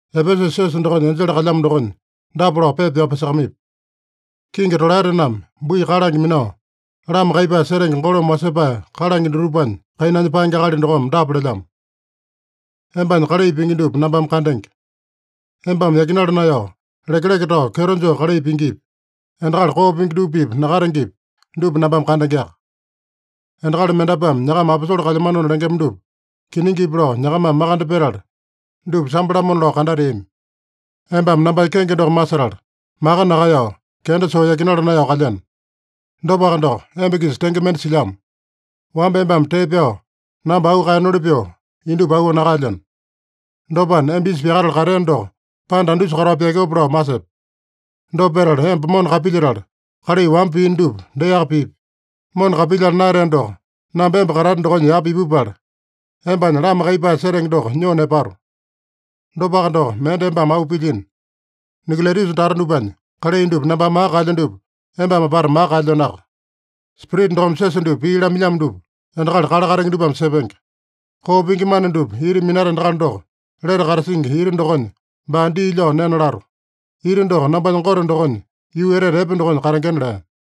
“Epesusa siosa dokonya enjele kalyamo dokonya dapa lao pepa pyao pyasakamaipi: ‘Kingi tolaetename bui kalange minao, lama kaiyepae setenge golome wasepae kalange dutupanya kainanya paenge akali dokome dapa lelyamo: Embanya kalai pingi dupa nambame kandenge. Embame yakinala naeyao, lekeleke tao, kyeto joo kalai pingipi, endakali koo pingi dupa-pipa nakatengepi, dupa nambame kandengeaka. Endakali mendapuame nyakama aposole kalyamanona lengema dupa kiningipi lao nyakamame makande petala, dupa sambo-lamona lao kandateami. Embame nambanya kenge doko masetala, maka nakaeyao, kenda soo yakinala naeyao kalyeno. Dopaka doko, emba-kisa tenge mende silyamo: Wamba embame tee pyao namba auu kaeyenoli pyoo, indupa auu nakaelyeno. Dopana, emba isa pyakatala kateeno doko panda andusa katao pyakeope lao masepe. Dopa petala emba mona kapilyetala, kalai wamba piino dupa deaka pipi. Mona kapilyala naeyateno doko, namba emba katate dokonya yapa ipupala, embanya lama kaiyepae setenge doko nyoo nepato. Dopaka doko, mende embame auu pilyino: Nikolaitusa tata dupanya kalai dupa nambame maka kaelyo dupa embame apata maka kaelyenoaka. Spirita dokome siosa dupa pii lamailyamo dupa endakali kale katenge dupame sepenge. Koo pingi mana dupa ita minata endakali doko, lete katasingi ita dokonya baa dii lyao nena lato. Ita doko nambanya Gote dokonya yuu etete epe dokonya katengena’” lea.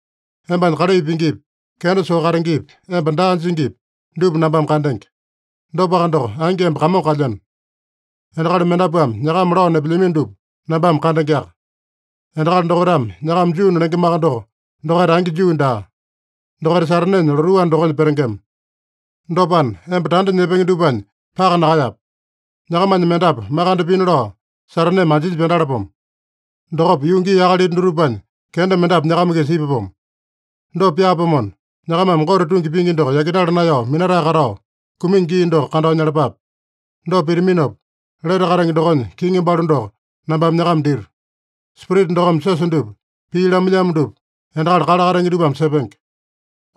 Embanya kalai pingipi, kenda soo katengepi, emba daa jingipi, dupa nambame kandenge. (Dopaka doko, angi emba kamongo kalyeno.) Endakali mendapuame nyakama lao nepelyamino dupa nambame kandengeaka. Endakali dokaitame nyakama Juuna lengemaka doko, dokaita angi Juu daa. Dokaita Satanenya lotuu anda dokonya petengema. Dopana, emba tanda nyepenge dupanya paka nakaeyape. Nyakamanya mendapu makande pina lao Sataneme anjinya pyandalapomo. Dokopa yuu gii akalita dutupanya kenda mendapu nyakama-kisa ipapomo. Dopa pyaapomona, nyakamame Gote tungi pingi doko yakinala naeyao minatae katao, kumingi gii doko kandao nyalapape. Dopa pitaminopa, lete katenge dokonya kiŋi balu doko nambame nyakama dito. Spirita dokome siosa dupa pii lamailyamo dupa endakali kale katenge dupame sepenge.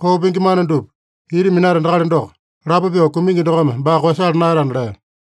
Koo pingi mana dupa ita minata endakali doko, lapo pyoo kumingi dokome baa koeyasala naeyatana’” lea.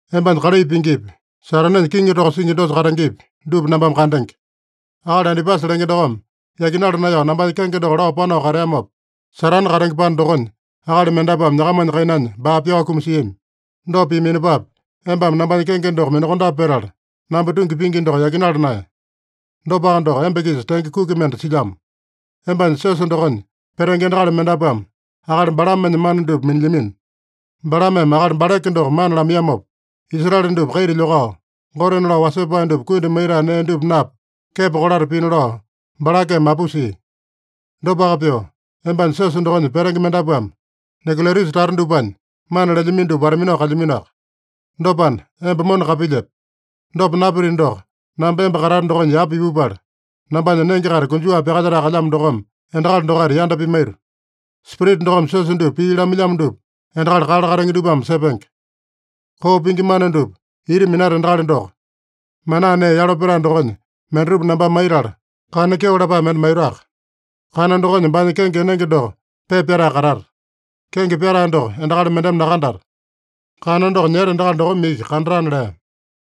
Embanya kalai pingipi, Satanenya kiŋi toko singi dosa katengepi, dupa nambame kandenge. Akali Antipasa lenge dokome yakinala naeyao nambanya kenge doko lao panao kateamopa, Satane katenge panda dokonya, akali mendapuame nyakamanya kainanya baa pyao kumasiami. Dopa piaminopapi, embame nambanya kenge doko minakondape petala, namba tungi pingi doko yakinala naeye. Dopaka doko, emba-kisa tenge kuki mende silyamo: Embanya siosa dokonya petenge endakali mendapuame akali Balamenya mana dupa minilyamino. Balameme akali Balake doko mana lamaiyamopa, Israele dupa kaita lyokao, gotena lao wasepae dupa kundi maitae nee dupa napa, kepo kolata pina lao Balakeme mapusia. Dopaka pyoo, embanya siosa dokonya petenge mendapuame Nikolaitusa tata dupanya mana lelyamino dupa wata-minao kalyaminoaka. Dopana, emba mona kapilyepe. Dopa napitino doko, namba emba katate dokonya yapa ipupala, nambanya nenge-kaita konjuwa pyakalyetae kalyamo dokome endakali dokaita yanda pimaito. Spirita dokome siosa dupa pii lamailyamo dupa endakali kale katenge dupame sepenge. Koo pingi mana dupa ita minata endakali doko, manaa nee yalo petae dokonya mendatupa nambame maitala, kana kyeo lapae mende maitoaka. Kana dokonya baanya kenge enenge doko pepa pyatae katata. Kenge pyatae doko endakali mendeme nakandata. Kana doko nyeta endakali dokome iki kandatana’” lea.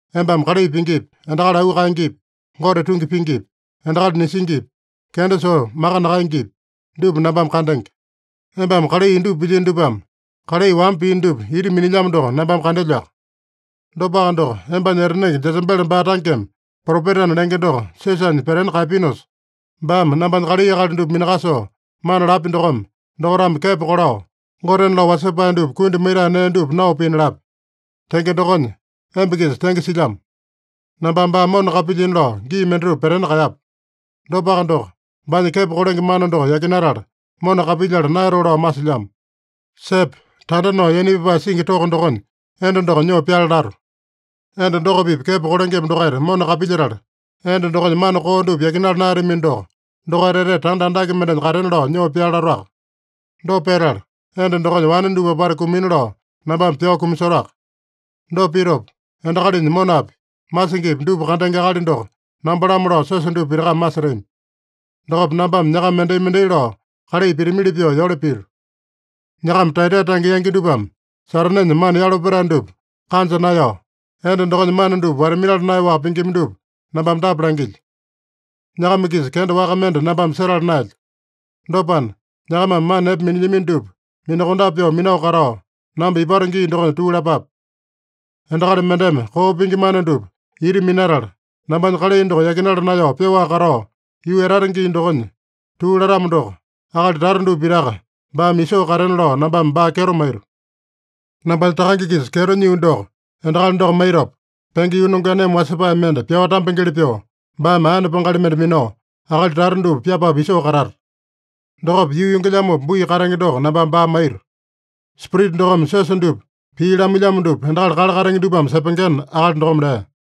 Embame kalai pingipi, endakali auu kaengepi, Gote tungi pingipi, endakali nisingipi, kenda soo maka nakaengepi, dupa nambame kandenge. Embame kalai indupa pilyino dupame kalai wamba piino dupa ita minilyamo doko nambame kandelyoaka. Dopaka doko, embanya etanenge Jesebele baa tangeme propetana lenge doko siosanya petena kaeyapinosa, baame nambanya kalai akali dupa minakasoo mana lapya dokome, dokaitame kepo kolao, gotena lao wasepae dupa kundi maitae nee dupa nao pina lapya. Tenge dokonya emba-kisa tenge silyamo. Nambame baa mona kapilyina lao gii mendatupa petena kaeyapu. Dopaka doko, baanya kepo kolenge mana doko yakinatala, mona kapilyala naeyatoo lao masilyamo. Sepe! Tanda nao yaina pyapae singi toko dokonya enda doko nyoo pyale lato. Enda doko-pipa kepo kolengema dokaita mona kapilyetala, enda dokonya mana koo dupa yakinala naeyatamino doko, dokaita etete tanda andake mendenya katena lao nyoo pyale latoaka. Dopa petala, enda dokonya wane dupa apata kumina lao nambame pyao kumasotoaka. Dopa pitopa, endakalinya monapi, masingipi dupa kandenge akali doko namba-lamo lao siosa dupa pitakame masetami. Dokopa nambame nyakama mendai-mendai lao kalai pitamili pyoo yole pito. Nyakama Taeyataita tange yangi dupame Satanenya mana yalo petae dupa kanja naeyao, enda dokonya mana dupa wata-minala naeyaowaka pingima dupa nambame dapa langilyo: Nyakama-kisa kenda waka mende nambame setala naelyo. Dopana, nyakamame mana epe minilyamino dupa minakondape pyoo minao katao, namba ipato gii dokonya tuu lapape. Endakali mendeme koo pingi mana dupa ita minatala, nambanya kalai doko yakinala naeyao pyoaka katao, yuu etata gii dokonya tuu latamo doko, akali tata dupa pitaka baame isoo katena lao nambame baa kyeto maito. Nambanya Takange-kisa kyeto nyio doko endakali doko maitopa, penge yuu nongeaneme wasepae mende pyao tambengeli pyoo, baame aene pangali mende minao akali tata dupa pyapapu isoo katata. Dokopa, yuu yongelyamopa bui katenge doko nambame baa maito. Spirita dokome siosa dupa pii lamailyamo dupa endakali kale katenge dupame sepengena,’” akali dokome lea.